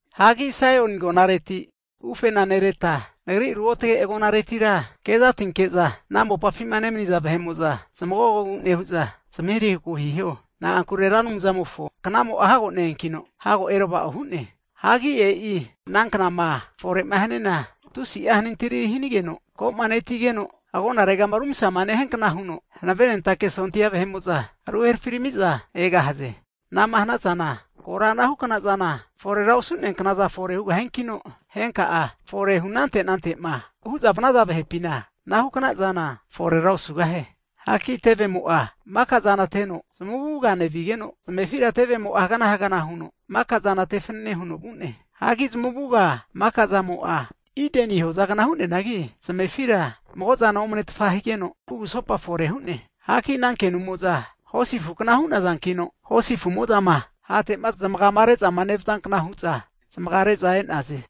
Hagi Saioni agonareti ufena nereta, Nagri ruotage agonaretira kezatinke'za ana mopafima nemaniza vahe'mo'za zamagogogu nehu'za, zamahirahiku hiho. Na'ankure Ra Anumzamofo knamo'a hago ne-eankino, hago erava'o hu'ne. Hagi e'i ana knama fore'ma haniana tusi'a hanintiri hanigeno, komanetigeno agonaregama rumsama nehiankna huno hanavenentake sondia vahe'mo'za ruherafiramiza egahaze. Anama hanazana kora anahukna zana forera osu'neanknaza fore hugahiankino, henka'a forehu anante anante'ma hu'za vanaza vahepina, anahukna zana forera osugahie. Hagi tevemo'a maka zana teno zamavuga nevigeno, zamefira tevemo'a hagana hagana huno mika zana tefanane huno vu'ne. Hagi zamavuga maka zamo'a Ideni hozagna hu'neanagi, zamefira mago zana omanetfa higeno kugusopa fore hu'ne. Hagi ana kenumo'za hosi afu kna hu'nazankino, hosi afumo'zama hate'ma zamagama reza nevazankna hu'za zamagare'za e'naze.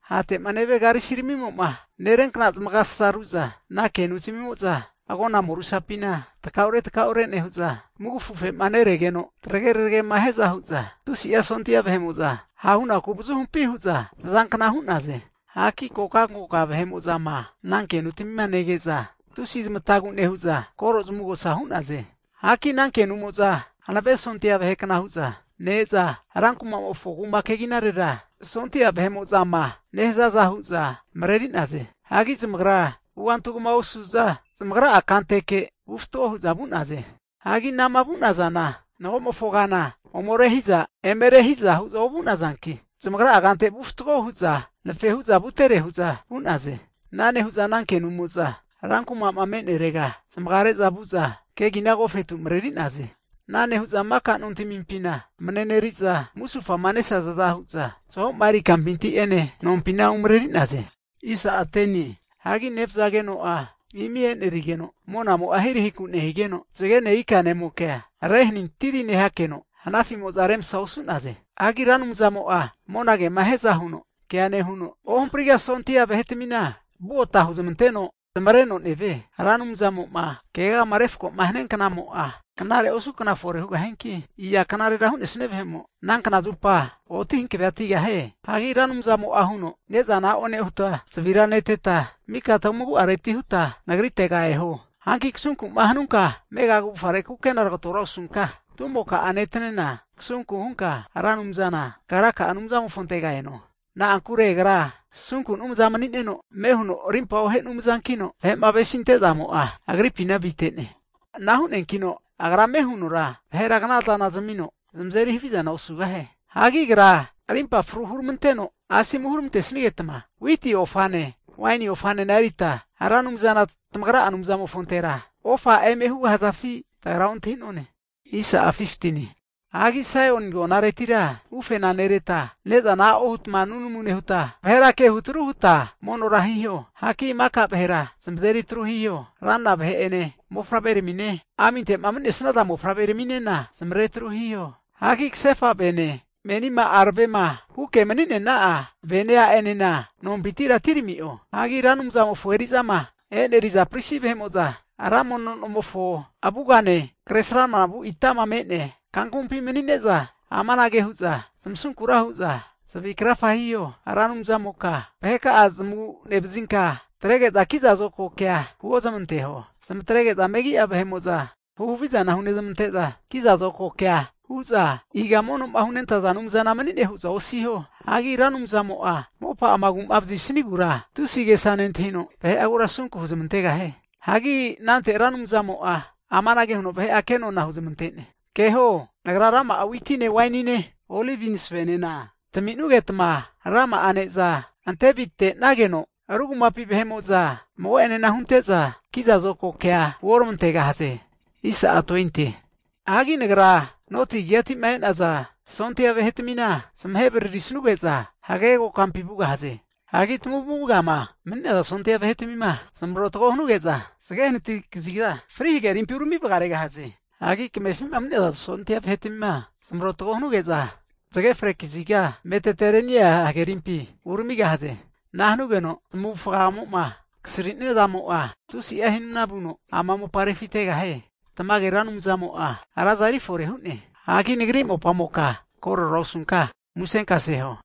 Hate'ma nevia karisimo'ma neriankna zamagasasa ru'za ana kenutmimo'za agona morusapina takaure takaure nehu'za mugafu afe'ma neregeno, tarage tregema hiaza hu'za tusi'a sondia vahe'mo'za hahunaku avazuhumpi hu'za vazankna hu'naze. Hagi kokankoka vahe'mo'zama ana kenutamima nege'za, tusi zamatagu nehu'za koro zamavugosa hu'naze. Hagi ana kenumo'za hanave sondi'a vahe kna hu'za ne-eza, ran kumamofo kuma keginarera sondia vahe'mo'zama nehazaza hu'za mareri'naze. Hagi zamagra vuganti kama osu'za zamagra'a kanteke vu fatgo hu'za vu'naze. Hagi anama vu'nazana, magomofo kana ome rehiza eme rehiza hu'za ovu'nazanki, zamagra'a kante vu fatgo huza kuma kegina anafe hu'za vutere hu'za vu'naze. Ana nehu'za ana kenumo'za ran kuma'ma me'nerega zamagare'za vu'za, kegina agofetu mareri'naze. Ana nehu'za maka nontmimpina mareneri'za, musufama nesazaza hu'za zahoma eri kampinti'ene nompina umareri'naze. Hagi nevazageno'a imi enerigeno, monamo'a ahirahiku nehigeno, zagene ikanemokea rehanintiri nehakeno, hanafimo'za remasa osu'naze. Hagi Ra Anumzamo'a monagema hiaza huno kea nehuno, ohampriga'a sondia vahetmina vugota huzmanteno zamavareno nevie. Ra Anumzamo'ma keagama refkoma hania knamo'a, knare osu kna fore hugahiankino iza knarera hu'nesia vahemo ana knazupa oti hankavetigahie? Hagi Ra Anumzamo'a huno, ne'zana a'o nehuta, zavira neteta, mika tamagu'areti huta Nagritega eho. Hagi kasunku'ma hanunka amega kavufgare kukena tagatora osunka, tumokamo'a netanena kasunka hunka Ra Anumzana kagra'a Anumzamofontera eno. Na'ankure Agra asunku Anumzana mani'neno, ame huno arimpa ohe Anumzankino, vahe'ma avesinte zamo'a Agripina avite'ne. Ana hu'neankino Agra ame hunora vahera knazana zamino, zamazeri havizana osugahie. Hagi Agra arimpa fru huramanteno, asomu huramantesigeta witi ofane waini ofanena erita Ra Anumzana tamagra'a Anumzantera ofa eme hugahazafi? tagra ontahi'none. Hagi Saioni agonareti ufena nereta, ne'zana a'o huta nunamu nehuta, vahera kehutru huta monora hiho. Hagi mika vahera zamazeri atru hiho, ranra vahe'ene mofavreramine, aminte'ma mani'nesnaza mofavreraminena zamavare atru hiho. Hagi kasefa vene a'enema menima aravema huke maninena'a vene a'enena nompintira atirami'o. Hagi Ra Anumzamofo eri'zama eneriza pristi vahe'mo'za, ra mono nomofo avugane, kresramana vu itama me'nea kankamumpi mani'neza amanage hu'za zamasunkura hu'za zavi krafage hiho. Ra Anumzamoka vaheka'a zamagu nevazinka, atrege'za kiza zokago kea huozmanteho. Zamatrege'za megi'a vahe'mo'za huhavizana hunezmante'za kiza zokago kea hu'za iga mono'ma hunentaza Anumzana mani'ne hu'za osiho. Hagi Ra Anumzamo'a mopa'ama agu'ma vazi'sanigura tusi agesa nentahino, vahe'agura asunku huzmantegahie. Hagi anante Ra Anumzamo'a amanage huno vahe'a kenona huzamante'ne, keho Nagra rama'a witine wainine, olivi masavenena tami'nugeta rama'a neza ante avite'nageno, ru kumapi vahe'mo'za mago'enena hunte'za kiza zokago kea huoramantegahaze. Hagi Nagra noti kazigatima e'naza sondia vahetamina zamahe vararisanuge'za hagege kokampi vugahaze. Hagi tamavugama mani'naza sondia vahetamina zamarotago hanuge'za zage hanati kaziga Fri hagerimpi urami vagaregahaze. Hagi kamefima mani'naza sondia vahetamina zamarotago hanuge'za zage fre kaziga Mediterenia hagerimpi uramigahaze. Ana hanugeno zamavufagamo'ma kasri'nia zamo'a tusi'a himna vuno ama mopa refitegahie. Tamage Ra Anumzamo'a raza erifore hu'ne. Hagi nagri mopamoka korera osunka, musenkase huo.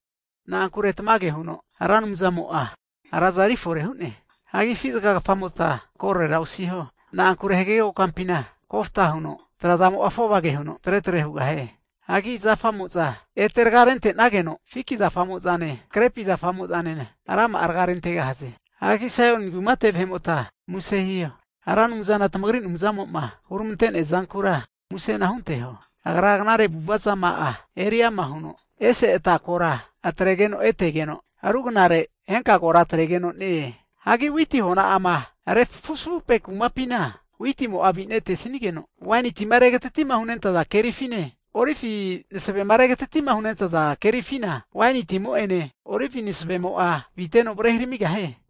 Na'ankure tamage huno Ra Anumzamo'a raza erifore hu'ne. Hagi afi zagagafamota korera osiho, na'ankure hagege kokampina kofta huno trazamo'a afovage huno tretre hugahie. Hagi zafamo'za ete raga rentenageno, fiki zafamo'zane grepi nofimo'zanena rama'a raga rentegahaze. Hagi Saioni kumate vahe'mota muse hiho. Ra Anumzana tamagri Anumzamo'ma huneramantea zankura musena hunteho. Agra knare avu'ava zama'a eri ama huno ese ata kora atregeno etegeno, rugnare henka kora ete atregeno ne-e. Hagi witi hona'ama refuzafupe kumapina witimo'a avinetesnigeno, waini tima regatatima hunentaza kerifine olivi masavema regatati'ma hunentaza kerifina waini timo'ene olivi masavemo'enena aviteno varehiramigahie.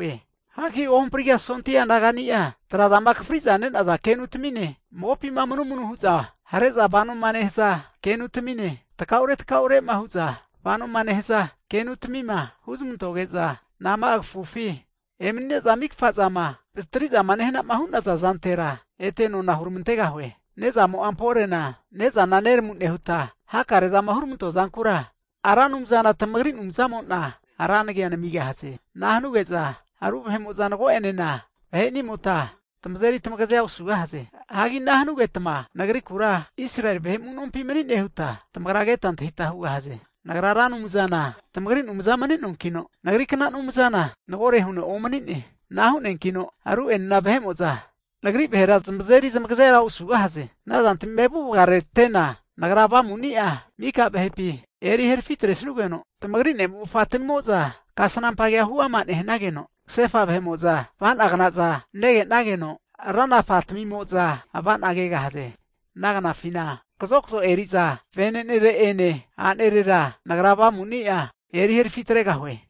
Hagi ohampriga'a sondia nagania, tra'zama akafri'za nenaza kenutamine, magopima manumanuma hu'za hare'za vanoma nehaza kenutamine, takaure takaure'ma hu'za vanoma nehaza kenutamima huzmantoge'za, nama'a kafufi emani'neza mika zama vatri'zama nehana'ma hu'naza zantera ete nona huramantegahue. Ne'zamo'a amporena ne'zana neramu nehuta, knare zama huramantoa zankura Ra Anumzana tamagri Anumzamo'na ra nagi namigahaze. Ana hanuge'za ru vahe'mo'za mago'enena vahe'nimota tamazeri tamagazea osugahaze. Hagi ana hanugetma Nagrikura Israeli vahe amunompi mani'ne huta tamagra keta antahita hugahaze. Nagra Ra Anumzana tamagri Anumza mani'noankino, nagrikna anumzana magore huno omani'ne. Ana hu'neankino ru'enena vahe'mo'za nagri vahera zamazeri zamagaze osugahaze. Ana zantamima evu vagamaretena Nagra Avamuni'a maka vahepi eri herafi atresugeno, tamagri ne'mofatamimo'za, kasnampa kea huama nehanageno, kasefa vahe'mo'za avana'gnaza negenageno, ranafa tamimo'za ava'na kegahaze. Ana knafina kazokazo eri'za venenere'ene a'nere'enena Nagra Avamu'ni'a eri herafi atregahue.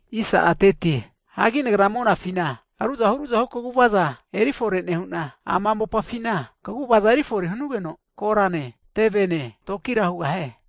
Hagi Nagra monafina ruzahu ru'zahu kaguvaza eri fore nehu'na, ama mopafina kaguvaza erifore hanugeno korane, tevene, toki'enena hugahie.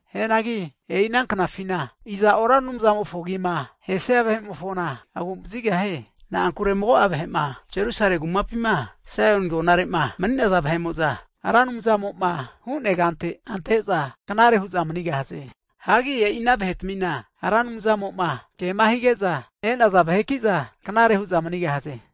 Hianagi e'i ana knafina iza'o Ra Anumzamofo agima ahesia vahe'mofona agu'vazigahie. Na'ankure mago'a vahe'ma Jerusalemi kumapima Saoni agonare'ma mani'naza vahe'mo'za Ra Anumzamo'ma hu'nea kante ante'za knare hu'za manigahaze. Hagi e'ina vahetamina Ra Anumzamo'ma kema hige'za e'naza vahekiza knare hu'za manigahaze.